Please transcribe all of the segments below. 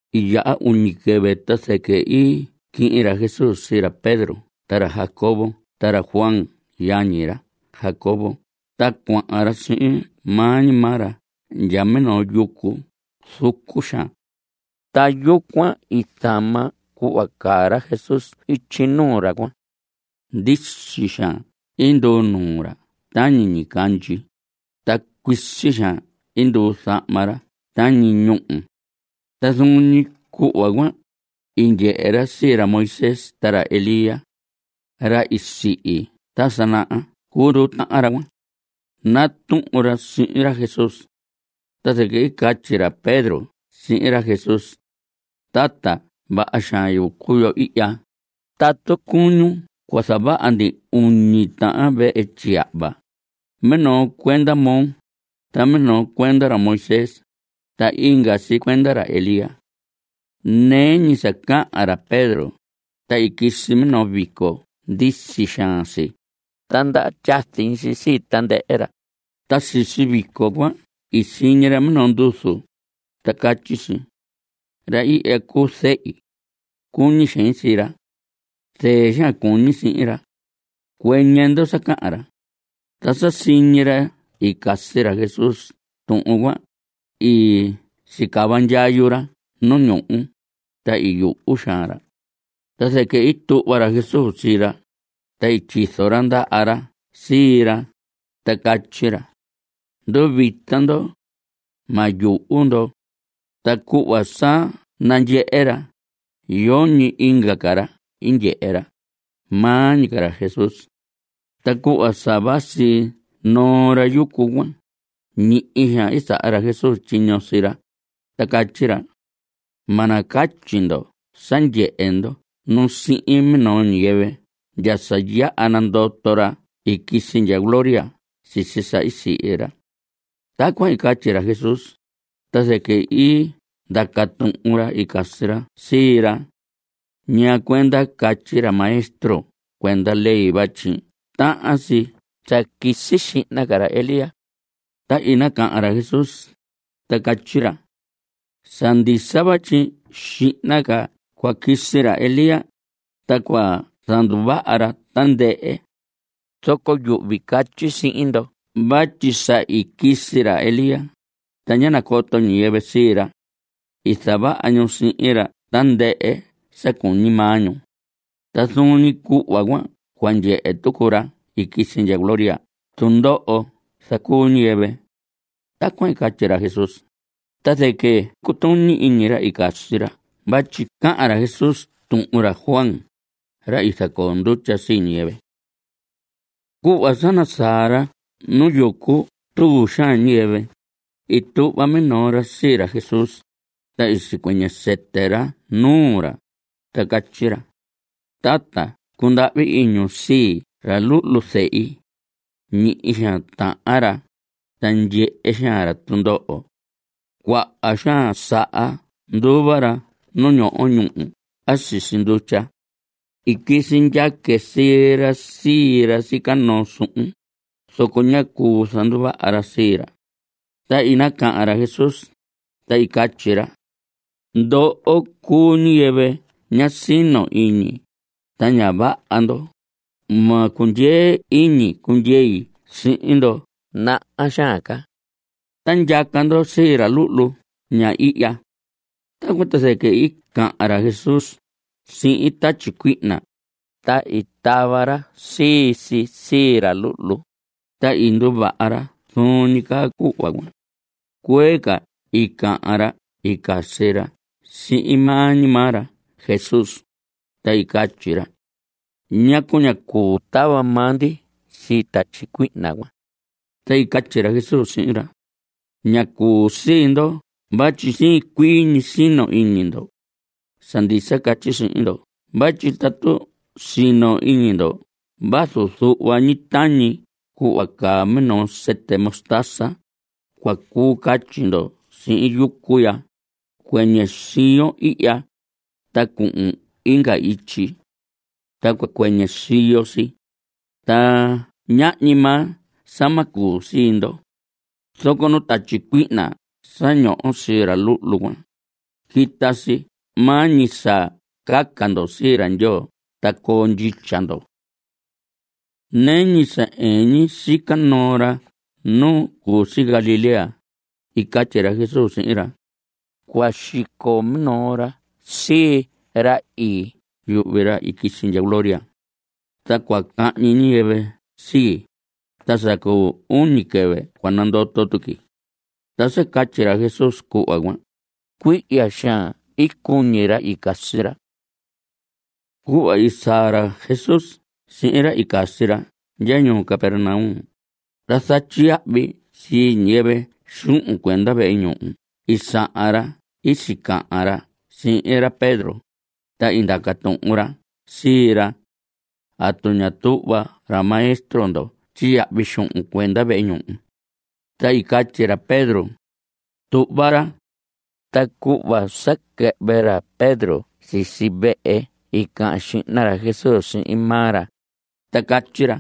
I yaha iñu quɨvɨ, ta zɨquɨ i quihin ra Jesús sii ra Pedro ta ra Jacobo ta ra Juan yañi ra Jacobo ta cuahan ra sihin maa ñi maa ra ndya minoo yucu zucu xaan. Ta yucuan i zama cuhva caa ra Jesús ityi nuu ra cuan. Ndisi xaan i nduu nuu ra tañi ñicandyi, ta cuisi xaan i nduu zahma ra tañi ñúhu. Ta zuun ñi cuhva cuan, i ndyehe ra sii ra Moisés ta ra Elías. (Ra i sihi ta sa naha cuu nduu tahan ra cuan.) Natuhun ra sihin ra Jesús. Ta zɨquɨ i catyi ra Pedro sihin ra Jesús: Tata, ¡vaha xaan yucu yo ihya! Tatu cuñun cua zavaha ndi uñi tahan vehe tyiyahva, minoo cuenda moo, ta minoo cuenda ra Moisés, ta inga si cuenda ra Elías. Nɨɨ ñi sa cahan ra Pedro, ta i quisi minoo vico ndisi xaan si, ta ndaha tyazi si sii tandɨhɨ ra; ta sisi vico cuan i siñi ra minoo nduzu, ta catyi si: Ra ihya cuu Zehi. Cuñi xein sii ra. Zɨɨ xaan cuñi sihin ra. Cuɨñɨ ndo sa cahan ra. Ta sa siñi ra i casi ra Jesús tuhun cuan, i sicava ndyayu ra nu ñuhu, ta i yuhu xaan ra. Ta zɨquɨ i tuhva ra Jesús sii ra, ta i tyizo ra ndaha ra sii ra, ta catyi ra: Nduvita ndo. Ma yuhu ndo. Ta cuhva sa nandyehe ra, yoñi inga ca ra ndyehe ra, maa ñi ca ra Jesús. Ta cuhva sa vasi noo ra yucu cuan, ñihi xaan i saha ra Jesús tyiño sii ra, ta catyi ra: Ma nacatyi ndo sa ndyehe ndo nu sihin minoo ñiyɨvɨ ndya sa yaha nandoto ra i quisi ndya gloria sisi sa i sihi ra. Tacuan i catyi ra Jesús, ta zɨquɨ i ndaca tuhun ra i casi ra sii ra: ¿Ñaa cuenda catyi ra maestro cuenda ley vatyi tahan si sa quisi xihna ca ra Elías? Ta i nacahan ra Jesús, ta catyi ra: Sa ndisa vatyi xihna ca cua quisi ra Elías, ta cua zanduvaha ra tandɨhɨ. Zoco yuhvi catyi sihin ndo vatyi sa i quisi ra Elías, ta ñá nacoto ñiyɨvɨ sii ra. I zavaha ñu sihin ra tandɨhɨ sa cuñi maa ñu. Ta zuun ñi cuhva cuan cua ndyehe tucu ra i quisi ndya gloria tundoho zacuu ñiyɨvɨ. Tacuan i catyi ra Jesús, ta zɨquɨ cutuñi iñi ra i casi ra vatyi cahan ra Jesús tuhun ra Juan, ra i zacoo ndutya sii ñiyɨvɨ. Cuhva sa i nasaa ra nu yucu tuu xaan ñiyɨvɨ, i tuhva minoo ra sii ra Jesús, ta i sicuɨñɨ sɨtɨ ra nuu ra, ta catyi ra: Tata, cundahvi iñun sii ra luhlu zehi. Ñihi xaan tahan ra, ta ndyehe xaan ra tundoho. Cuaha xaan saha nduva ra nu ñoho ñúhu a sisi ndutya. I quisi ndyaque sii ra sii ra sica noo suhun, zoco ñá cuu zanduvaha ra sii ra. Ta i nacahan ra Jesús, ta i catyi ra: ¡Ndoho cuu ñiyɨvɨ ña sino iñi, ta ña vaha ndo! Ma cundyee iñi cundyei sihin ndo naha xaan ca. Ta ndyaca ndo sii ra luhlu ña ihya. Tacuan ta zɨquɨ i cahan ra Jesús sihin tatyi cuihna, ta i tava ra sii si sii ra luhlu, ta i nduvaha ra zuun ñi caa cuhva cuan. Cuee ca i cahan ra i casi ra sihin maa ñi maa ra Jesús, ta i catyi ra: ¿Ñacu ñá cuu tava maa ndi sii tatyi cuihna cuan? Ta i catyi ra Jesús sihin ra: Ñá cuu sii ndo vatyi siin cuii ñi sino iñi ndo. Sa ndisa catyi sihin ndo vatyi tatu sino iñi ndo vazu zuhva ñi tañi cuhva caa minoo sɨtɨ mostaza, cua cuu catyi ndo sihin yucu ya: “Cuɨñɨ siyon ihya, ta cuhun inga ityi.” Ta cua cuɨñɨ siyo si. Ta ñahñi maa sa ma cuu sii ndo. Zoco nuu tatyi cuihna sa ñoho sii ra luhlu cuan, quita si maa ñi sa caca ndo sii ra Ndyoo ta coo ndyitya ndo. Nɨɨ ñi sa ɨɨn ñi sica noo ra nu cu si Galilea, i catyi ra Jesús sihin ra: Cua xico minoo ra sii ii, yuhvi ra i quisi ndya gloria. Ta cua cahñi ñiyɨvɨ sii, ta sa cu uñi quɨvɨ cua nandoto tuqui. Ta sa catyi ra Jesús cuhva cuan, cuihya xaan i cuñi ra i casi ra. Cuhva i saa ra Jesús sihin ra i casi ra ndya ñuu Capernaum, ra zatyiyahvi sii ñiyɨvɨ xuhun cuenda vehe ñuhu i sahan ra i sicahan ra sihin ra Pedro, ta i ndaca tuhun ra sii ra: ¿Atu ña tuhva ra maestro ndo tyiyahvi xuhun cuenda vehe ñuhu? Ta i catyi ra Pedro: Tuhva ra. Ta cuhva sa quɨhvɨ ra Pedro sisi vehe i cahan xihna ra Jesús sihin maa ra, ta catyi ra: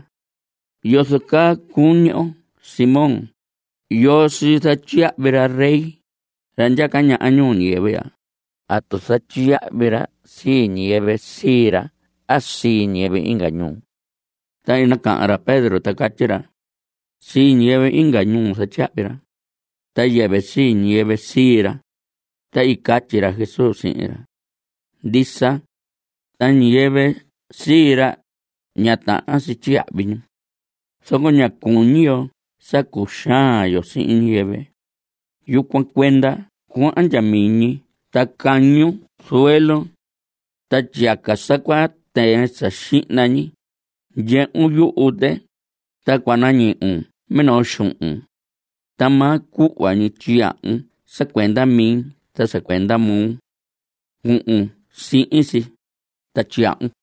¿Yozo caa cuñi oo, Simón? ¿Yoo sii zatyiyahvi ra rey, ra ndyaca ñaha ñuu ñiyɨvɨ ya? ¿Atu zatyiyahvi ra sii ñiyɨvɨ sii ra a sii ñiyɨvɨ inga ñuu? Ta i nacahan ra Pedro ta catyi ra: Sii ñiyɨvɨ inga ñuu zatyiyahvi ra. Ta yɨvɨ sii ñiyɨvɨ sii ra. Ta i catyi ra Jesús sihin ra: Ndisa. Ta ñiyɨvɨ sii ra, ña tahan si tyiyahvi ñu. Zoco ña cuñi yo sa zacuxaan yo sii ñiyɨvɨ. Yucuan cuenda cuahan ndya miñi ta cañun zuelun. Tyiyaca sa cua tɨɨn sii si sa xihna ñi, ndyehun yuhu tɨ, ta cua nañuhun minoo xuhun. Ta maa cuhva ñi tyiyahvun sa cuenda mi ta sa cuenda moo. Cuhun sihin si, ta tyiyahvun.